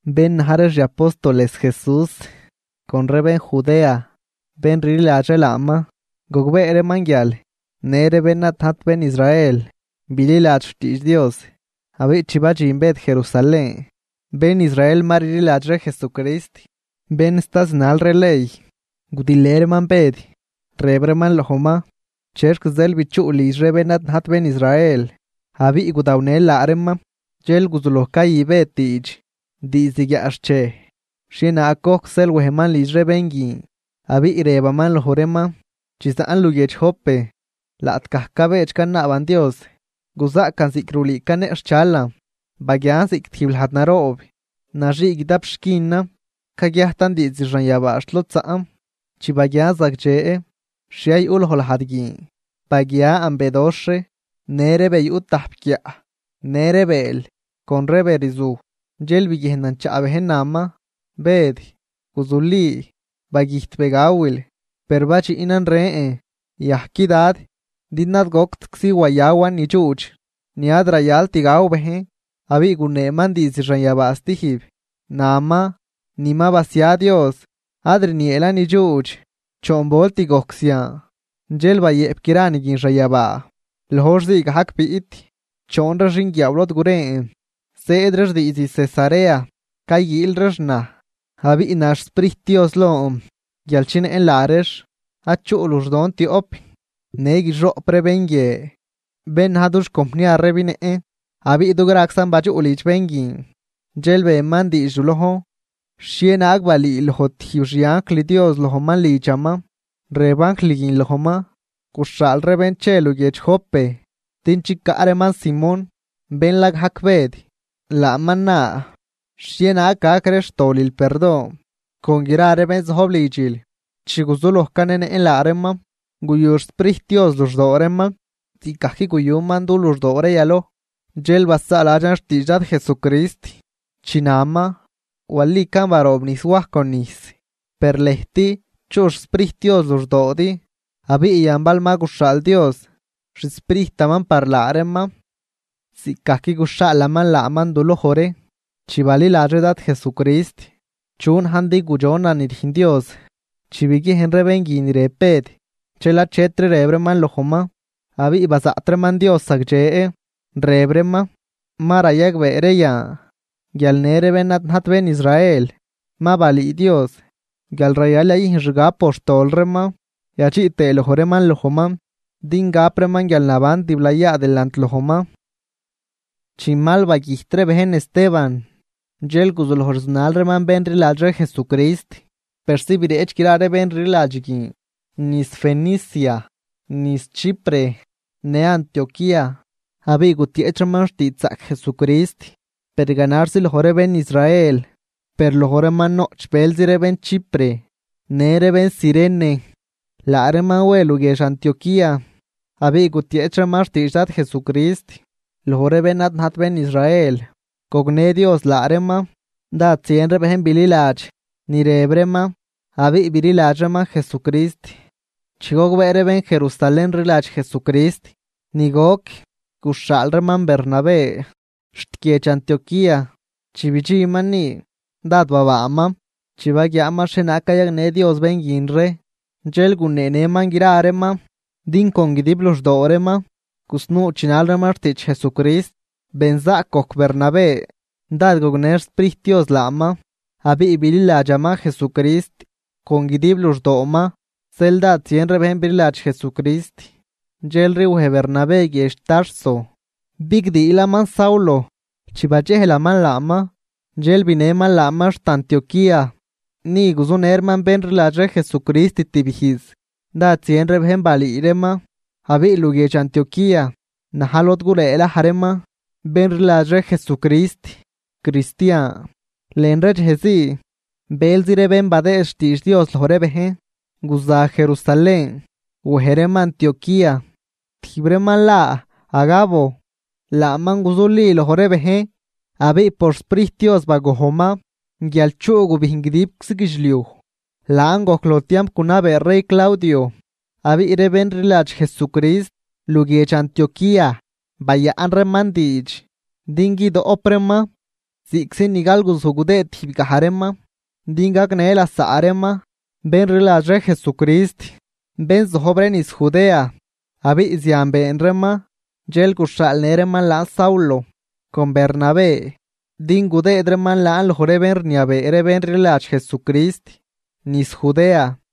Bén na̱j ree xi apóstoles Jesús con ree bén Judea, bén rliladx ree laaman, gogbee reeman guial në ree bén ad najt bén Israel bililadx xtiidx Dios. Abiꞌ chi badxin Bëd Jerusalén, bén Israel ma rliladx ree Jesucrist, bén sta zinal ree ley, gudilë reeman Bëd. Rëb reeman lojman: ―¿Chexc zeel bichuꞌl lidx ree bén ad najt bén Israel abiꞌ gudawnël laa reeman? Dxel guzuloj cayü Bëd diidx diizd guiaꞌxchej xhienaag gojc zeel wejman lidx ree bén guin abiꞌ rëbaman loj reeman: ―Chi zaꞌn luguiedx Jope, laꞌtgaj cabedx canaaban Dios, guzaꞌcan ziꞌc rulüü caneꞌxhchalan. Baguian ziꞌc tijb lajd naroob naxii guidap xquinan caguiajtan diizd xanyabaa xt lod zaꞌn. Chi baguian zagdxe xhie yuꞌ loj lajd guin, baguian bedoxh ree në ree be yuꞌ tajp guiaꞌ në ree bëël con ree be rzuj. Dxel biguiejnan chaꞌ bejn, naman: “Bëd, guzuli, bagüjt be gawil.” Per badxiꞌnan rën: “Yajqui, Dad, din ad goctczi wayawan nidxuudx, ni ad rayalt gaw bejn.” Abiꞌ guneeman diizd xanyabaa stijb, naman: “Ni ma basia Dios, ad rnieelan nidxuudx.” Choon volt gojc zian, dxel bayëꞌp gra ni guin xanyabaa. Loj hor zii gajc biꞌt choon ree xinguiaaw lod guren, zëëd reex diizd Cesarea, cayguiil reex naj. Abiꞌ na xSprijt Dios lon guial chinëꞌn laa reex, ad chuꞌ luxdon tioꞌp. Në guixoꞌp ree bén guie bén na̱j dux compniar ree binëꞌn. Abiꞌ dugraczan badxuꞌ lidx bén guin. Dxel beman diidx du lojn xhienaag balüüloj tijb xi anjl Dios lojman lidxaman, rëb anjl guin lojman: “Guxhaal ree bén che luguiedx Jope din chicaꞌ reeman Simón, bén la gajc Bëd, laaman na xhienaag gac ree xtolil perdon, con gra ree bén zojb lidxil.” Chi guzuloj canenëꞌn laa reeman, guyu xSprijt Dios luxdoo reeman ziꞌcgajc guyuman du luxdoo ree yaloj. Dxel basaaladxan xtiidx Dad Jesucrist chi naman: “Walican baroobnijs Waj con nijs, per lëjt chuꞌ xSprijt Dios luxdoodi.” Abiꞌ yan bal ma guxhaal Dios xSprijtaman par laa reeman ziꞌcgajc guxhaalaman laaman du loj ree chi baliladx ree Dad Jesucrist, ¿chu najn din gudxonan ni rüjn Dios? Chi biguiejn ree bén guin ni rëb Bëd, dxel achetri rëb reeman lojman abiꞌ bazaꞌt reeman Dios zagdxe, rëb reeman: ―¡Ma rayagbee ree yan guial në ree bén ad najt bén Israel ma balüü Dios guial rayal yayüjn xgab por xtol reeman yadxiꞌ tëë loj reeman lojman din gap reeman guialnaban tiblayaa delant lojman! Chi mal bagüjt ree bejn Esteban, dxel guzuloj rzunal reeman bén rliladx ree Jesucrist persi bireꞌch gra ree bén rliladx guin niz Fenicia, niz Chipre në Antioquía. Abiꞌ gutieꞌch reeman xtiidxzaꞌc Jesucrist, per ganaxzi loj ree bén Israel. Per loj reeman noꞌch bëlzi ree bén Chipre në ree bén Cirene. Laa reeman we luguiedx Antioquía abiꞌ gutieꞌch reeman xtiidx Dad Jesucrist loj ree bén ad najt bén Israel. Gognë Dios laa reeman, dád zien ree bejn bililadx ni rëb reeman abiꞌ bililadx reeman Jesucrist. Chi gogbee ree bén Jerusalén rliladx Jesucrist ni goc, guxhaal reeman Bernabé xt guiedx Antioquía. Chi bidxinman ni, dád babaaman chi baguiaaman xhienaag cayagnë Dios bén guin ree. Dxel guneenëman gra reeman din con guidib luxdoo reeman gusnuu chinal reeman xtiidx Jesucrist. Benzaꞌc gojc Bernabé, dád gognë xSprijt Dios laaman abiꞌ bililadxaman Jesucrist con guidib luxdooman. Zeel dád zien ree bejn bililadx Jesucrist. Dxelri wej Bernabé guiedx Tarso bigdiilaman Saulo. Chi badxejlaman laaman, dxel binëman laaman xt Antioquía. Ni guzunë reeman bén rliladx ree Jesucrist tibijz, dád zien ree bejn balüü reeman. Abiꞌ luguiedx Antioquía na̱j lod gulëëlaj reeman bén rliladx ree Jesucrist, cristian. Lën ree dxej zii bëlzi ree bén badëë xtiidx Dios loj ree bejn, guza Jerusalén wej reeman Antioquía. Tijb reeman la Agabo, laaman guzuli loj ree bejn abiꞌ por xSprijt Dios bagojnman guial chuꞌ gubijn guidibczi guidxliuj. Laan gojc loj tiamp gunabee rey Claudio. Abiꞌ ree bén rliladx Jesucrist luguiedx Antioquía, bayaꞌn reeman diidx din guidoꞌp reeman ziꞌctzi ni galguzuj gudëëd tijb gaj reeman, din gagnë lasaꞌ reeman, bén rliladx ree Jesucrist, bén zojb ree niz Judea. Abiꞌ zian been reeman. Dxel guxhaalnë reeman laan Saulo con Bernabé din gudëëd reeman laan loj ree bén rniabee ree bén rliladx Jesucrist niz Judea.